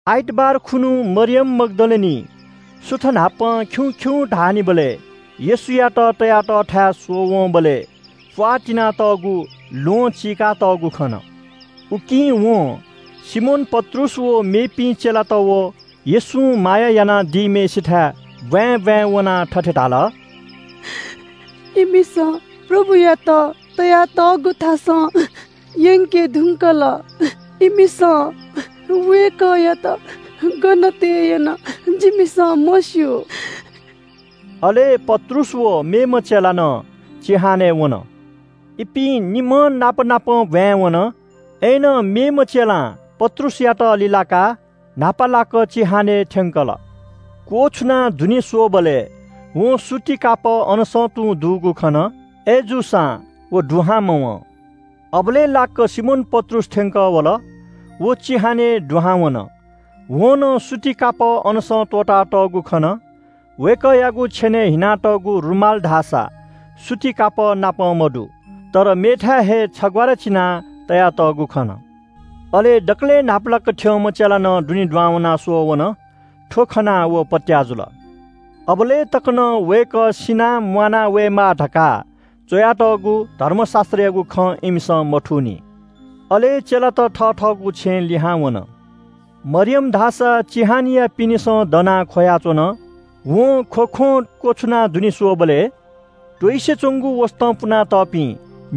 आइतबार खुन्‍हु मरियम मग्‍दलिनी सुथ न्‍हापां खिउँ खिउँ धाःनिबलय् येशूयात तया तःथाय् स्‍वःवंबलय् प्‍वाः तिनातःगु ल्‍वहं चीकातःगु खन। उकिं वं सिमोन पत्रुस व मेपिं चेलात व येशूं माया यानादीम्‍हय्‌सिथाय् ब्‍वाँय् ब्‍वाँय् वनाः थथे धाल – “इमिसं प्रभुयात तयातःगु थासं यंके धुंकल। इमिसं वय्‌कःयात गन तये यन, जिमिसं मस्‍यू।” अले पत्रुस व मेम्‍ह चेला नं चिहानय् वन। इपिं निम्‍हं नापनापं ब्‍वाँय् वन। अय्‌नं मेम्‍ह चेलां पत्रुसयात लिलाकाः न्‍हापालाक चिहानय् थ्‍यंकल। क्‍वछुनाः दुने स्‍वःबलय् वं सूती कापः अनसं तुं दुगु खन। अय्‌जूसां व दुहां मवं। अबलय् लाक्‍क सिमोन पत्रुस थ्‍यंकः वल। व चिहानय् दुहां वन। वं नं सूती कापः अनसं त्‍वःतातःगु खन। वय्‌कःयागु छेनय् हिनातःगु रुमाल धाःसा सूती कापः नाप मदु, तर मेथाय् हे छग्‍वारा चिनाः तयातःगु खन। अले दकलय् न्‍हापालाक थ्‍यंम्‍ह चेला नं दुने वनाः स्‍वःवन। थ्‍व खनाः व पत्‍याः जुल। अबलय् तक नं वय्‌कः सिनाः म्‍वाना वयेमाः धकाः च्‍वयातःगु धर्मशास्‍त्रयागु खँ इमिसं मथूनि। अले चेलात थथःगु छेँय् लिहां वन। मरियम धाःसा चिहानया पिनेसं दनाः ख्‍वयाच्‍वन। वं ख्‍वख्‍वं क्‍वछुनाः दुने स्‍वःबलय् त्‍वइसे च्‍वंगु वसतं पुनातःपिं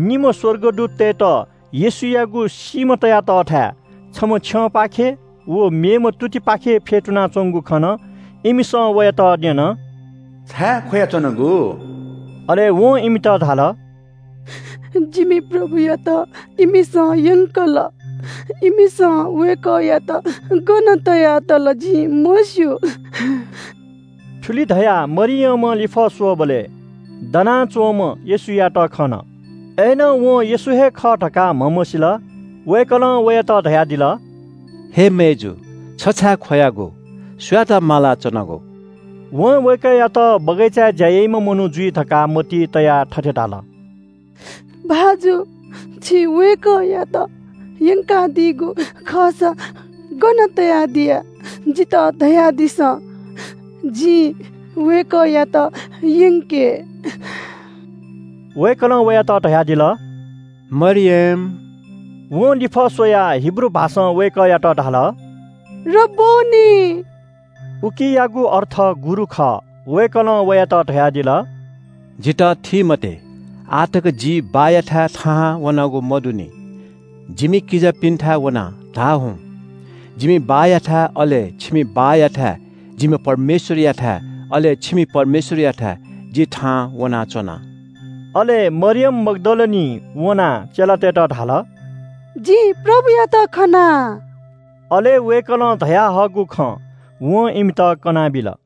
निम्‍ह स्‍वर्गदूततय्‌त येशूयागु सीम्‍ह तया तःथाय् छम्‍ह छ्यंपाखे व मेम्‍ह तुतिपाखे फ्‍यतुनाच्‍वंगु खन। इमिसं वयात न्‍यन – “छाय् ख्‍वयाच्‍वनागु?” अले वं इमित धाल – “जिमि प्रभुयात इमिसं यंकल। इमिसं वय्‌कःयात गन तया तल जिं मस्‍यू।” थुलि धयाः मरियमं लिफः स्‍वःबलय् दनाच्‍वंम्‍ह येशूयात खन। अय्‌नं वं येशू हे खः धकाः म्‍हमसील। वय्‌कलं वयात धयादिल – “अय् मय्‌जु, छ छाय् ख्‍वयागु? सुयात मालागु?” वं वय्‌कःयात बगैँचाय् ज्‍या याइम्‍ह मनू जुइ धकाः मतिइ तयाः थथे धाल – “भाजु, छिं वय्‌कःयात यंकादियागु खःसा गन तयादिया जितः धयादिसँ। जिं वय्‌कःयात यंके।” वय्‌कलं वयात धयादिल – “मरियम!” वं लिफः स्‍वयाः हिब्रू भाषां वय्‌कःयात धाल – “रब्‍बोनी।” उकियागु अर्थ “गुरु” खः। वय्‌कलं वयात धयादिल – “जितः थी मते, आः तक जि बाःयाथाय् थाहां वनागु मदुनि। जिमि किजापिन्‍थाय् वनाः धाः हुँ – ‘जिमि बाःयाथाय् अले छिमि बाःयाथाय्, जिम्‍ह परमेश्‍वरयाथाय् अले छिमि परमेश्‍वरयाथाय् जि थाहां वनाच्‍वना।’” अले मरियम मग्‍दलिनीं वनाः चेलातय्‌त धाल – “जिं प्रभुयात खना।” अले वय्‌कलं धयाहःगु खँ वं इमित कनाबिल।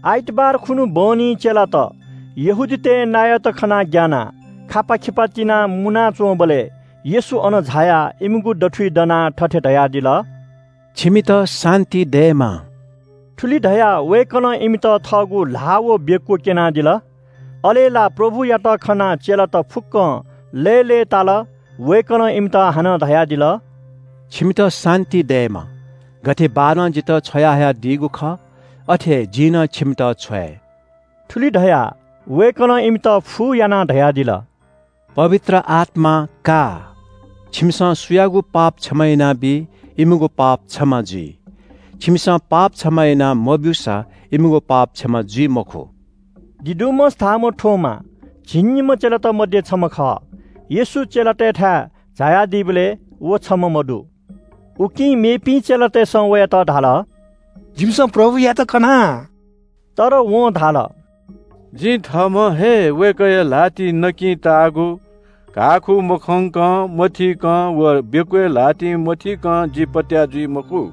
आइतबार खुन्‍हु बहनी चेलात यहूदीतय् नायःत खनाः ग्‍यानाः खापात तिनाः मुनाच्‍वंबलय् येशू अन झायाः इमिगु दथुइ दनाः थथे धयादिल – “छिमित शान्‍ति दयेमा।” थुलि धयाः वय्‌कलं इमित थःगु ल्‍हाः व बेक्‍व क्‍यनादिल। अले ला प्रभुयात खनाः चेलात फुक्‍कं लय्‌लय्‌ताल। वय्‌कलं इमित हानं धयादिल – “छिमित शान्‍ति दयेमा। गथे बाःनं जितः छ्वयाहयादीगु खः अथे हे जिं नं छिमित छ्वये।” थुलि धयाः वय्‌कलं इमित फू यानाः धयादिल – “पवित्र आत्‍मा का। छिमिसं सुयागु पाप क्षमा यानाबी इमिगु पाप क्षमा जुइ। छिमिसं पाप क्षमा याना मब्‍यूसा इमिगु पाप क्षमा जुइ मखु।” दिदुमस धाःम्‍ह थोमा झिंनिम्‍ह चेलात मध्‍ये छम्‍ह खः। येशू चेलातय्‌थाय् झायादीबलय् व छम्‍ह मदु। उकिं मेपिं चेलातय्‌सं वयात धाल “जिमिसं प्रभुयात खना।” तर वं धाल, “जिं थःम्‍हं हे वय्‌कःया ल्‍हातिइ नकिं ताःगु घाःखू मखंकं, मथीकं व बेक्‍वय् ल्‍हातिं मथीकं जि पत्‍याः जुइ मखु।”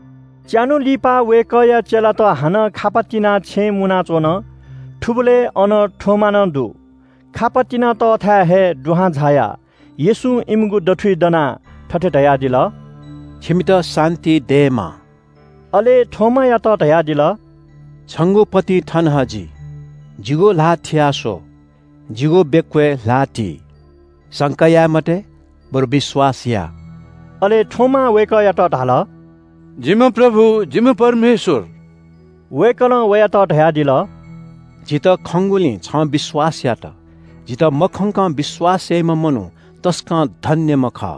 च्‍यान्‍हु लिपा, वय्‌कःया चेलात हानं खापा तिनाः छेँय् मुनाच्‍वन। थुबलय् अन थोमा नं दु। खापा तिनातःथाय् हे दुहां झायाः येशूं इमिगु दथुइ दनाः थथे धयादिल – “छिमित शान्‍ति दयेमा।” अले थोमायात धयादिल – “छंगु पतिं थन हजि, जिगु ल्‍हाः थिया स्‍वः। जिगु बेक्‍वय् ल्‍हाः ति। संका याये मते, बरु विश्‍वास या।” अले थोमां वय्‌कःयात धाल – “जिम्‍ह प्रभु, जिम्‍ह परमेश्‍वर।” वय्‌कलं वयात धयादिल – “जितः खंगुलिं छं विश्‍वास यात। जितः मखंकं विश्‍वास याइम्‍ह मनू तसकं धन्‍यम्‍ह खः।”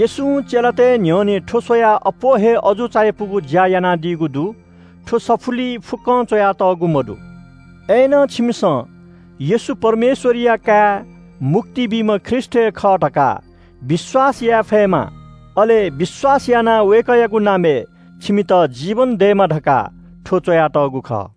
येशूं चेलातय् न्‍ह्यःने थ्‍व स्‍वयाः अप्‍वः हे अजू चायापुगु ज्‍या यानादीगु दु। थ्‍व सफुलिइ फुक्‍कं च्‍वयातःगु मदु। अय्‌नं छिमिसं येशू परमेश्‍वरया काय्, मुक्ति बीम्‍ह ख्रीष्‍ट हे खः धकाः विश्‍वास याये फयेमा, अले विश्‍वास यानाः वय्‌कःयागु नामय् छिमित जीवन दयेमा धकाः थ्‍व च्‍वयातःगु खः।